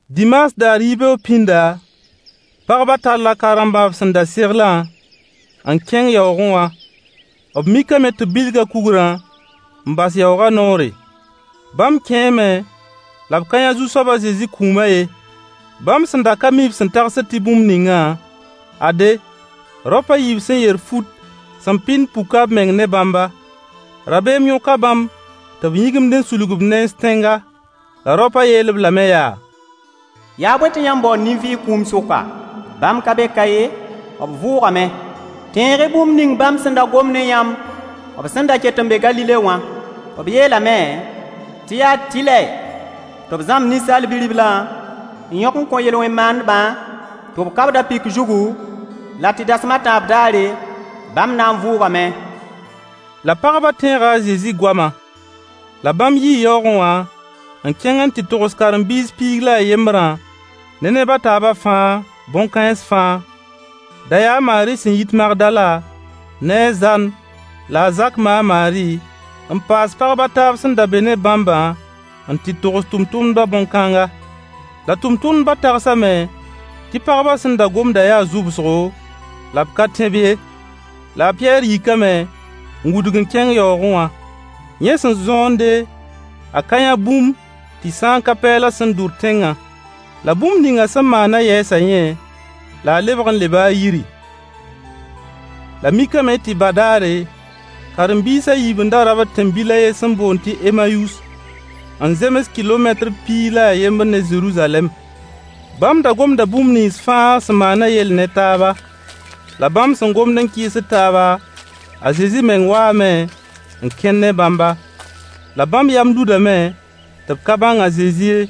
Dimaas daar yibeoog pĩnda, pagbã talla ka-rambã b sẽn da seglã n kẽng yaoogẽ wã. B mikame tɩ b bilga kugrã n bas yaoogã noore. Bãmb kẽeme la b ka yã Zu-soab a Zezi kũumã ye. Bãmb sẽn da ka mi b sẽn tagsd tɩ bũmb ningã, ade, raop a yiib sẽn yer fut sẽn pɩnd puka b meng ne bãmba. Rabeem yõka bãmb tɩ b yĩgimd n sulg b nens tẽnga. La raopã yeel-b lame yaa: Yaa bõe tɩ yãmb baood nin-vɩɩg kũum sʋka? [Bãmb ka be ka ye, b vʋʋgame.] Tẽeg-y bũmb ning bãmb sẽn da gom ne yãmb b sẽn da ket n be Galile wã. B yeelame tɩ yaa tɩlɛ tɩ b zãmb Ninsaal Bi-riblã n yõk n kõ yel-wẽn maandbã tɩ b ka-b da-pɩk zugu, la tɩ rasem a tãab daare bãmb na n vʋʋgame. La pagbã tẽega a Zezi goama. La bãmb yii yaoogẽ wã n kẽng n tɩ togs karen-biis piig la a yembrã ne neb a taabã fãa bõn-kãens fãa. Da yaa a Maari sẽn yit Magdala, ne a Zan la a Zak ma a Maari, n paas pagb a taab sẽn da be ne bãmbã n tɩ togs tʋmtʋmdbã bõn-kãnga. La tʋmtʋmdbã tagsame tɩ pagbã sẽn da gomdã yaa zʋbsgo la b ka tẽ-b ye. La a Pɩyɛɛr yikame n wudg n kẽng yaoogẽ wã. Yẽ sẽn zõonde, a ka yã bũmb tɩ sã n ka pɛɛlã sẽn dʋr tẽngã. La bũmb ninga sẽn maana yɛɛsa yẽ, la a lebg n leba a yiri. La mikame tɩ badaare, karen-biis a yiib n da rabd tẽn-bil a yen sẽn boond tɩ Emayus, n zems kɩlometr piig la a yembr ne Zeruzalɛm. Bãmb da gomda bũmb nins fãa sẽn maanã yell ne taaba. La bãmb sẽn gomd n kɩɩsd taaba, a Zezi meng waame n kẽn ne bãmba. La bãmb yam ludame tɩ b ka bãng a Zezi ye.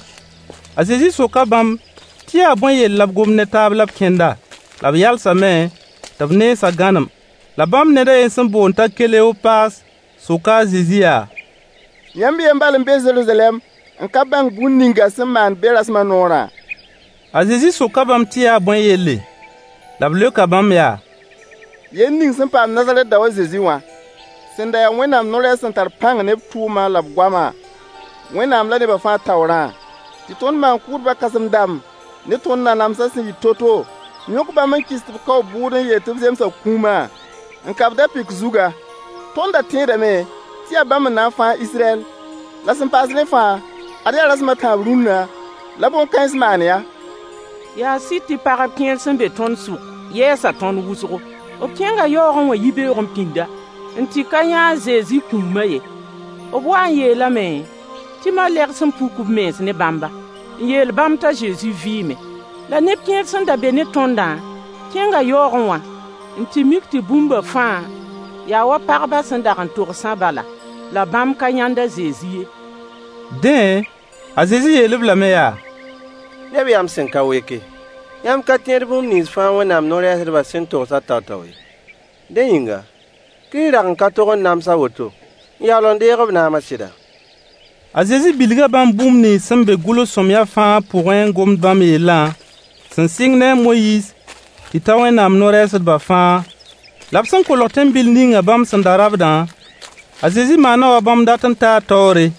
A Zezi soka bãmb tɩ yaa bõe yell la b gomd ne taab la b kẽnda. La b yalsame tɩ b nensã gãnem. La bãmb ned a yen sẽn boond t'a Keleopaas soka a Zezi yaa: Yãmb y yen bal n be Zeruzalɛm n ka bãng bũmb ninga sẽn maan be rasmã noorã? A Zezi soka bãmb tɩ yaa bõe yelle. La b leoka bãmb yaa: Yell ning sẽn paam Nazarɛt dao a Zezi wã. Sẽn da yaa Wẽnnaam no-rɛɛs sẽn tar pãng ne b tʋʋma la b goama, Wẽnnaam la nebã fãa taoorã. Tɩ tõnd maan-kʋʋdbã kãsem-dãmb ne tõnd nanamsã sẽn yɩ to-to n yõk bãmb n kɩs tɩ b kao b bʋʋd n yeel tɩ b zemsa kũuma, n ka-b da-pɩk zugã. Tõnd da tẽedame tɩ yaa bãmb n na n fãag Israyɛl, la sẽn paas rẽ fãa, ad yaa rasem a tãab rũnna la bõn-kãens maan-yã. Yaa sɩd tɩ pagb kẽer sẽn be tõnd sʋk yɛɛsa tõnd wʋsgo. B kẽnga yaoogẽ wã yibeoogẽ pĩnda, n tɩ ka yã a Zezi kũuma ye. B waa n yeelame tɩ malegs n puk b mens ne bãmba, n yeel bãmb t'a Zezi vɩɩme. La neb kẽer sẽn da be ne tõndã kẽnga yaoogẽ wã n tɩ mik tɩ bũmba fãa yaa wa pagbã sẽn dag togsã bala. La bãmb ka yãnd a Zezi ye. Dẽ, a Zezi yeel-b lame yaa: Neb yam sẽn ka weke, yãmb ka tẽed bũmb nins fãa Wẽnnaam no-rɛɛsdbã sẽn togsã tao-tao ye! Dẽ yĩnga, Kirist dag n ka tog n nams a woto n yaool n deeg b naamã sɩda? A Zezi bilga bãmb bũmb nins sẽn be gʋls-sõamyã fãa pʋgẽ n gomd bãmb yellã, sẽn sɩng ne a Moyiis tɩ ta Wẽnnaam no-rɛɛsdbã fãa. La b sẽn kolg tẽn-bil ninga bãmb sẽn da rabdã, a Zezi maana wa bãmb dat n taa taoore.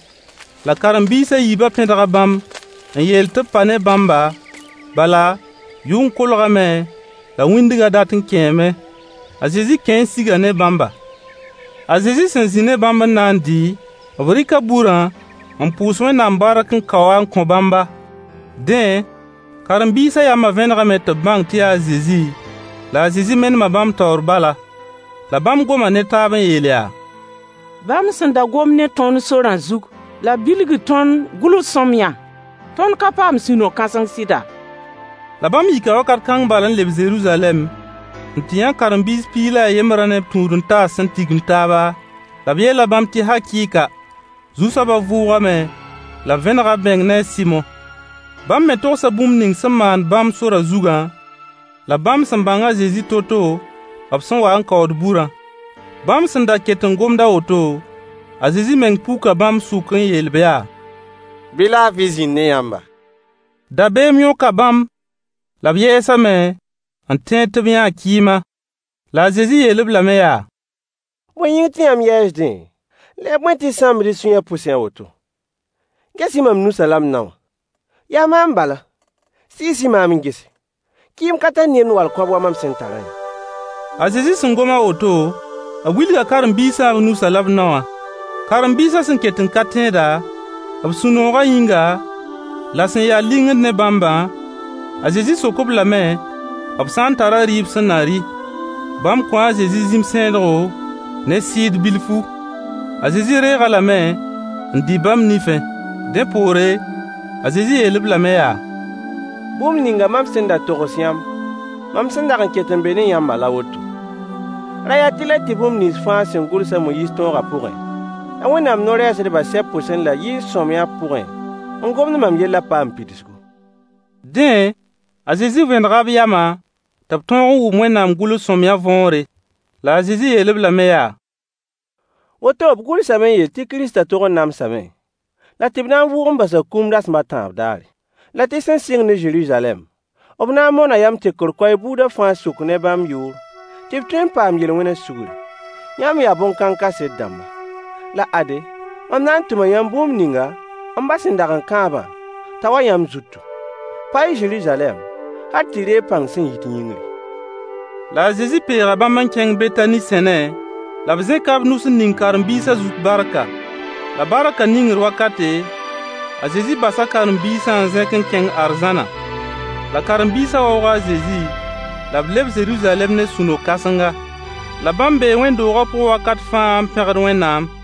La karen-biis a yiibã pẽdga bãmb n yeel tɩ b pa ne bãmba, bala, yʋng kolgame la wĩndgã dat n kẽeme. A Zezi kẽe n siga ne bãmba. A Zezi sẽn zĩ ne bãmb n na n dɩ, b rɩka burã n pʋʋs Wẽnnaam bark n kao-a n kõ bãmba. Dẽ, karen-biisã yama vẽnegame tɩ b bãng tɩ yaa a Zezi, la a Zezi menema bãmb taoor bala. La bãmb goma ne taab n yeel yaa: Bãmb sẽn da gomd ne tõnd sorã zug la b bilgid tõnd gʋls-sõamyã, tõnd ka paam sũ-no-kãseng sɩda? La bãmb yika wakat kãng bal n leb Zeruzalɛm n tɩ yã karen-biis piig la a yembrã ne b tũud-n-taas sẽn tigim taaba, la b yeela bãmb tɩ hakɩɩka! Zu-soaba vʋʋgame la b vẽnega b meng ne a Sɩmo. Bãmb me togsa bũmb ning sẽn maan bãmb sorã zugã, la bãmb sẽn bãng a Zezi to-to b sẽn wa n kaood burã. Bãmb sẽn da ket n gomd a woto, a Zezi meng puka bãmb sʋk [n yeel-b yaa: Bɩ laafɩ zĩnd ne yãmba]. Dabeem yõka bãmb la b yɛɛsame n tẽed tɩ b yãa kɩɩma. La a Zezi yeel-b lame yaa: Bõe yĩng tɩ yãmb yɛɛsdẽ, la yaa bõe tɩ y sãmbd y sũyã pʋsẽ a woto? Ges-y mam nusã la m nao wã. Yaa maam bala, Sɩɩs-y maam n gese. Kɩɩm ka tar nemd wall kõab wa mam sẽn tarã ye. A Zezi sẽn gom a woto, b wilga karen-biisã b nusã la b nao wã. Karen-biisã sẽn ket n ka tẽeda, b sũ-nooga yĩnga, la sẽn ya lingr ne bãmbã, a Zezi sok-b lame b sã n tara rɩɩb be sẽn na rɩ. Bãmb kõo a Zezi zĩm-sẽedgo ne sɩɩd bilfu. A Zezi reeg-a lame n dɩ bãmb nifẽ. Dẽ poore, a Zezi yeel-b lame yaa: Bũmb ninga mam sẽn da togs yãmb mam sẽn dag n ket n be ne yãmba la woto: Ra yaa tɩlɛ tɩ bũmb nins fãa sẽn gʋls a Moyiis tõoga pʋgẽ la Wẽnnaam no-rɛɛsdbã sɛb pʋsã la yɩɩn-sõamyã pʋgẽ n gomd mam yellã paam pidsgu. Dẽ, a Zezi vẽnega b yamã tɩ b tõog wʋm Wẽnnaam gʋls sõamyã võore. La a Zezi yeel-b lame yaa: Woto b gʋlsame n yeel tɩ Kiristã tog n namsame la tɩ b na n vʋʋg n basa kũum rasem a tãab daare. La tɩ sẽn sɩng ne Zeruzalɛm, b na n moona yam tekr koɛɛg buuda fãa sʋk ne bãmb yʋʋr tɩ b tõe n paam yel-wẽna sʋgri. Yãmb yaa bõn-kãng kaset-dãmba. La ade, mam na n tʋma yãmb bũmb ninga m ba sẽn dag n kãabã, t'a wa yãmb zutu. Pa-y Zeruzalɛm hal tɩ y deeg pãng sẽn yit yĩngri. La a Zezi peega bãmb n kẽng Betani sẽne, la b zẽka b nus n ning karen-biisã zut barka. La barkã ningr wakate, a Zezi basa karen-biisã n zẽk n kẽng arzãna. La karen-biisã waooga a Zezi, la b leb Zeruzalɛm ne sũ-no-kãsenga. La bãmb bee wẽnd-doogã pʋg wakat fãa n pẽgd Wẽnnaam.